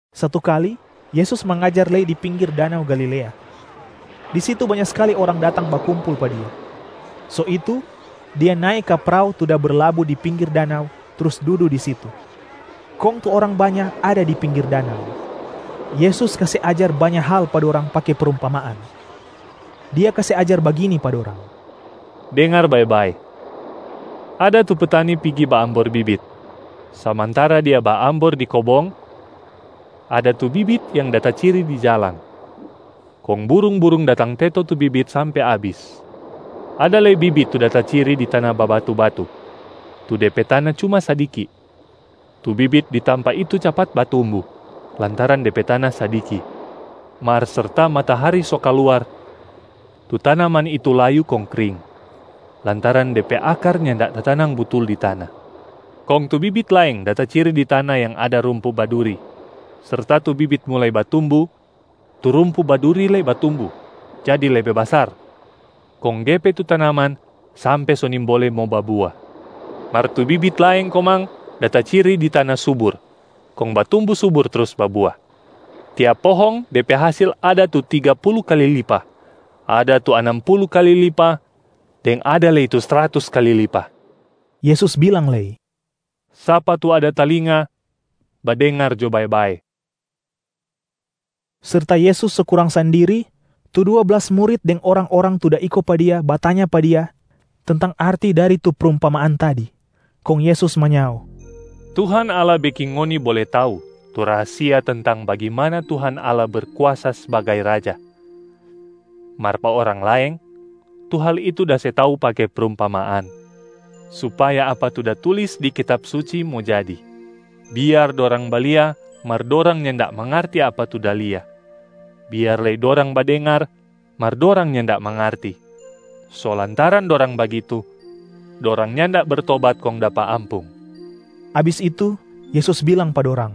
Satu kali Yesus mangajar lei di pinggir danau Galilea. Di situ banya skali orang datang bakumpul pa Dia. So itu, Dia nae ka prao tu da berlabu di pinggir danau trus dudu di situ, kong tu orang banya ada di pinggir danau. Yesus kase ajar banya hal pa dorang pake prumpamaan. Dia kase ajar bagini pa dorang, “Dengar bae-bae, ada tu petani pigi baambor bibit. Samantara dia baambor di kobong, ada tu bibit yang da taciri di jalang, kong burung-burung datang teto tu bibit sampe abis. Ada lei bibit tu da taciri di tana babatu-batu, tu de pe tana cuma sadiki. Tu bibit di tampa itu capat batumbu, lantaran de pe tana sadiki. Mar serta matahari so kaluar, tu tanaman itu layu kong kring lantaran de pe akar nyanda tatanang butul di tana. Kong tu bibit laeng da taciri di tana yang ada rumpu baduri. Serta tu bibit mulai batumbu, tu rumpu baduri lei batumbu jadi lebe basar kong gepe tu tanaman sampe so nimbole mo babua. Mar tu bibit laeng komang da taciri di tana subur kong batumbu subur trus babua. Tiap pohong de pe hasil ada tu tiga pulu kali lipa, ada tu anam pulu kali lipa, deng ada lei tu sratus kali lipa.” Yesus bilang lei, “Sapa tu ada talinga, badengar jo bae-bae.” Serta Yesus so kurang sandiri, tu dua blas murit deng orang-orang tu da iko pa Dia batanya pa Dia tentang arti dari tu prumpamaan tadi. Kong Yesus manyao, “Tuhan Allah beking ngoni bole tau tu rahasia tentang bagimana Tuhan Allah Berkuasa sbagai Raja. Mar pa orang laeng, tu hal itu da se tau pake prumpamaan, supaya apa tu da tulis di Kitab Suci mo jadi, ‘Biar dorang balia, mar dorang nyanda mangarti apa tu da lia. Biar lei dorang badengar, mar dorang nyanda mangarti. So lantaran dorang bagitu, dorang nyanda bertobat kong dapa ampung.’” Abis itu, Yesus bilang pa dorang,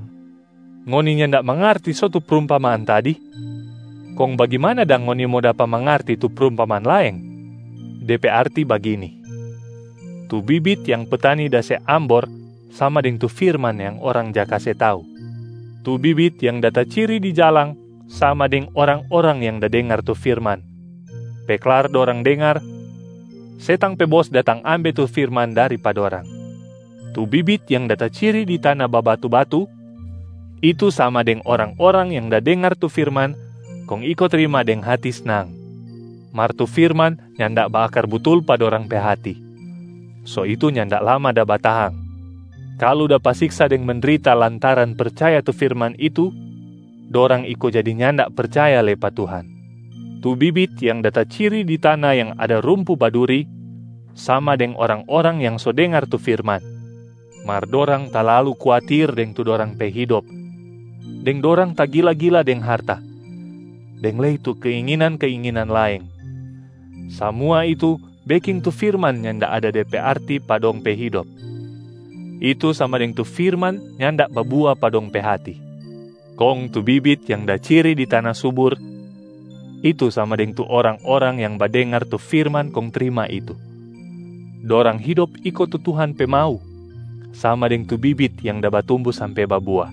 “Ngoni nyanda mangarti so tu prumpamaan tadi? Kong bagimana dang ngoni mo dapa mangarti tu prumpamaan laeng? De pe arti bagini: tu bibit yang petani da se ambor sama deng tu firman yang orang ja kase tau. Tu bibit yang da taciri di jalang sama deng orang-orang yang da dengar tu firman. Pe klar dorang dengar, setang pe bos datang ambe tu firman dari pa dorang. Tu bibit yang da taciri di tana babatu-batu, itu sama deng orang-orang yang da dengar tu firman kong iko trima deng hati snang. Mar tu firman nyanda baakar butul pa dorang pe hati, so itu nyanda lama da batahang. Kalu dapa siksa deng mendrita lantaran percaya tu firman itu, dorang iko jadi nyanda percaya lei pa Tuhan. Tu bibit yang da taciri di tana yang ada rumpu baduri sama deng orang-orang yang so dengar tu firman, mar dorang talalu kuatir deng tu dorang pe hidop deng dorang tagila-gila deng harta deng lei tu keinginan-keinginan laeng. Samua itu beking tu firman nyanda ada de pe arti pa dong pe hidop, itu sama deng tu firman nyanda babua pa dong pe hati. Kong tu bibit yang da ciri di tana subur, itu sama deng tu orang-orang yang badengar tu firman kong trima itu. Dorang hidop iko tu Tuhan pe mau, sama deng tu bibit yang da batumbu sampe babua.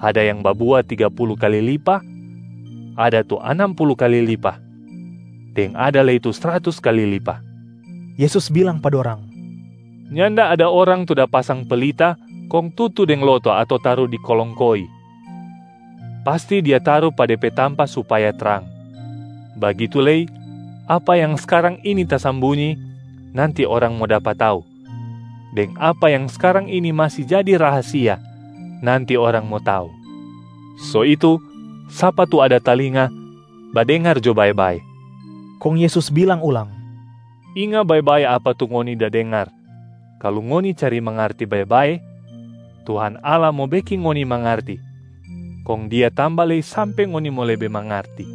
Ada yang babua tiga pulu kali lipa, ada tu anam pulu kali lipa, deng ada lei tu sratus kali lipa.” Yesus bilang pa dorang, “Nyanda ada orang tu da pasang pelita kong tutu deng loto ato taru di kolong koi. Pasti dia taru pa de pe tampa supaya trang. Bagitu lei, apa yang skarang ini tasambunyi, nanti orang mo dapa tau, deng apa yang skarang ini masi jadi rahasia, nanti orang mo tau. So itu sapa tu ada talinga, badengar jo bae-bae!” Kong Yesus bilang ulang, “Inga bae-bae apa tu ngoni da dengar. Kalu ngoni cari mangarti bae-bae, Tuhan Allah mo beking ngoni mangarti, kong Dia tamba lei sampe ngoni mo lebe mangarti.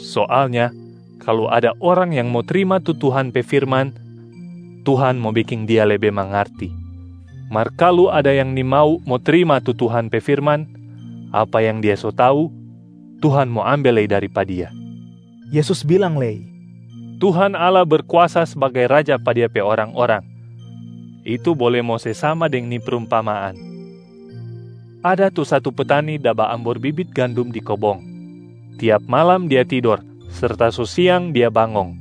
Soalnya kalu ada orang yang mo trima tu Tuhan pe firman, Tuhan mo beking dia lebe mangarti. Mar kalu ada yang nimau mo trima tu Tuhan pe firman, apa yang dia so tau, Tuhan mo ambe lei dari pa dia.” Yesus bilang lei, “Tuhan Allah Berkuasa sbagai Raja pa Dia pe orang-orang, itu bole mo se sama deng ni prumpamaan: ada tu satu petani da baambor bibit gandum di kobong. Tiap malam dia tidor serta so siang dia bangong,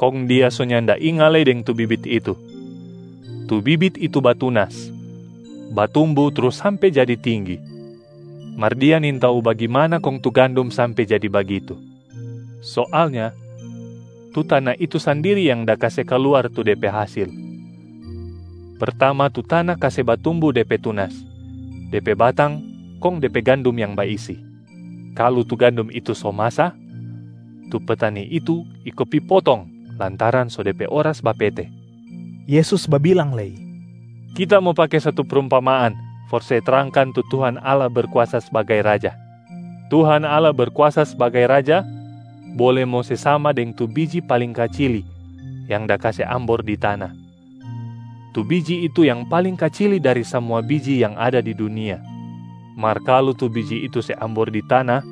kong dia so nyanda inga lei deng tu bibit itu. Tu bibit itu batunas, batumbu trus sampe jadi tinggi, mar dia nintau bagimana kong tu gandum sampe jadi bagitu. Soalnya tu tana itu sandiri yang da kase kaluar tu de pe hasil. Pertama tu tana kase batumbu de pe tunas, de pe batang kong de pe gandum yang baisi. Kalu tu gandum itu so masa, tu petani itu iko pi potong lantaran so de pe oras bapete.” Yesus babilang lei, “Kita mo pake satu prumpamaan for se trangkan tu Tuhan Allah Berkuasa sbagai Raja. Tuhan Allah Berkuasa sbagai Raja bole mo se sama deng tu biji paling kacili yang da kase ambor di tana. Tu biji itu yang paling kacili dari samua biji yang ada di dunia. Mar kalu tu biji itu se ambor di tana,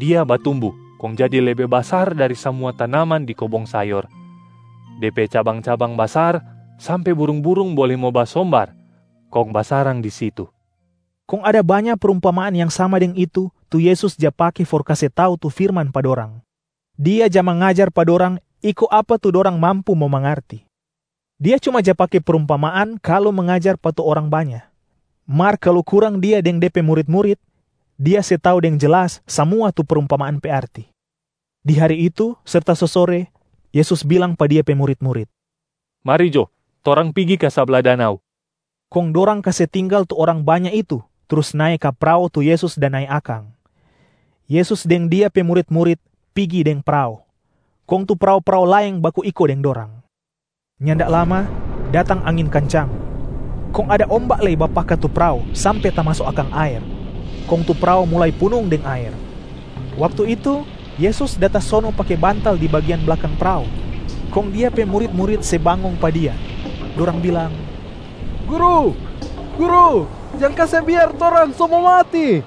dia batumbu kong jadi lebe basar dari samua tanaman di kobong sayor. De pe cabang-cabang basar sampe burung-burung bole mo basombar kong basarang di situ.” Kong ada banya prumpamaan yang sama deng itu, tu Yesus ja pake for kase tau tu firman pa dorang. Dia ja mangajar pa dorang iko apa tu dorang mampu mo mangarti. Dia cuma ja pake prumpamaan kalu mangajar pa tu orang banya. Mar kalu kurang Dia deng De pe murit-murit, Dia se tau deng jelas samua tu prumpamaan pe arti. Di hari itu, serta so sore, Yesus bilang pa Dia pe murit-murit, “Mari jo torang pigi ka sabla danau.” Kong dorang kase tinggal tu orang banya itu trus nae ka prao tu Yesus da nae akang. Yesus deng Dia pe murit-murit pigi deng prao, kong tu prao-prao laeng baku iko deng dorang. Nyanda lama datang angin kancang, kong ada omba lei bapaka tu prao sampe tamaso akang aer kong tu prao mulai punung deng aer. Waktu itu Yesus da tasono pake bantal di bagian blakang prao, kong Dia pe murit-murit se bangong pa Dia, dorang bilang, “Guru, Guru jang kase biar torang so mo mati.”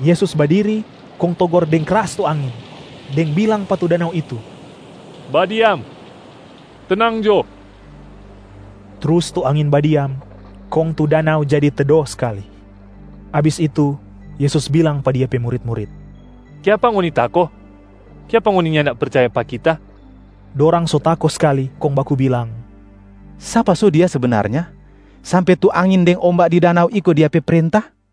Yesus badiri kong togor deng kras tu angin, deng bilang pa tu danau itu, “Badiam! Tenang jo!” Trus tu angin badiam, kong tu danau jadi tedo skali. Abis itu, Yesus bilang pa Dia pe murit-murit, “Kiapa ngoni tako? Kiapa ngoni nyanda percaya pa Kita?” Dorang so tako skali kong baku bilang, “Sapa so Dia sebenarnya sampe tu angin deng omba di danau iko Dia pe prenta?”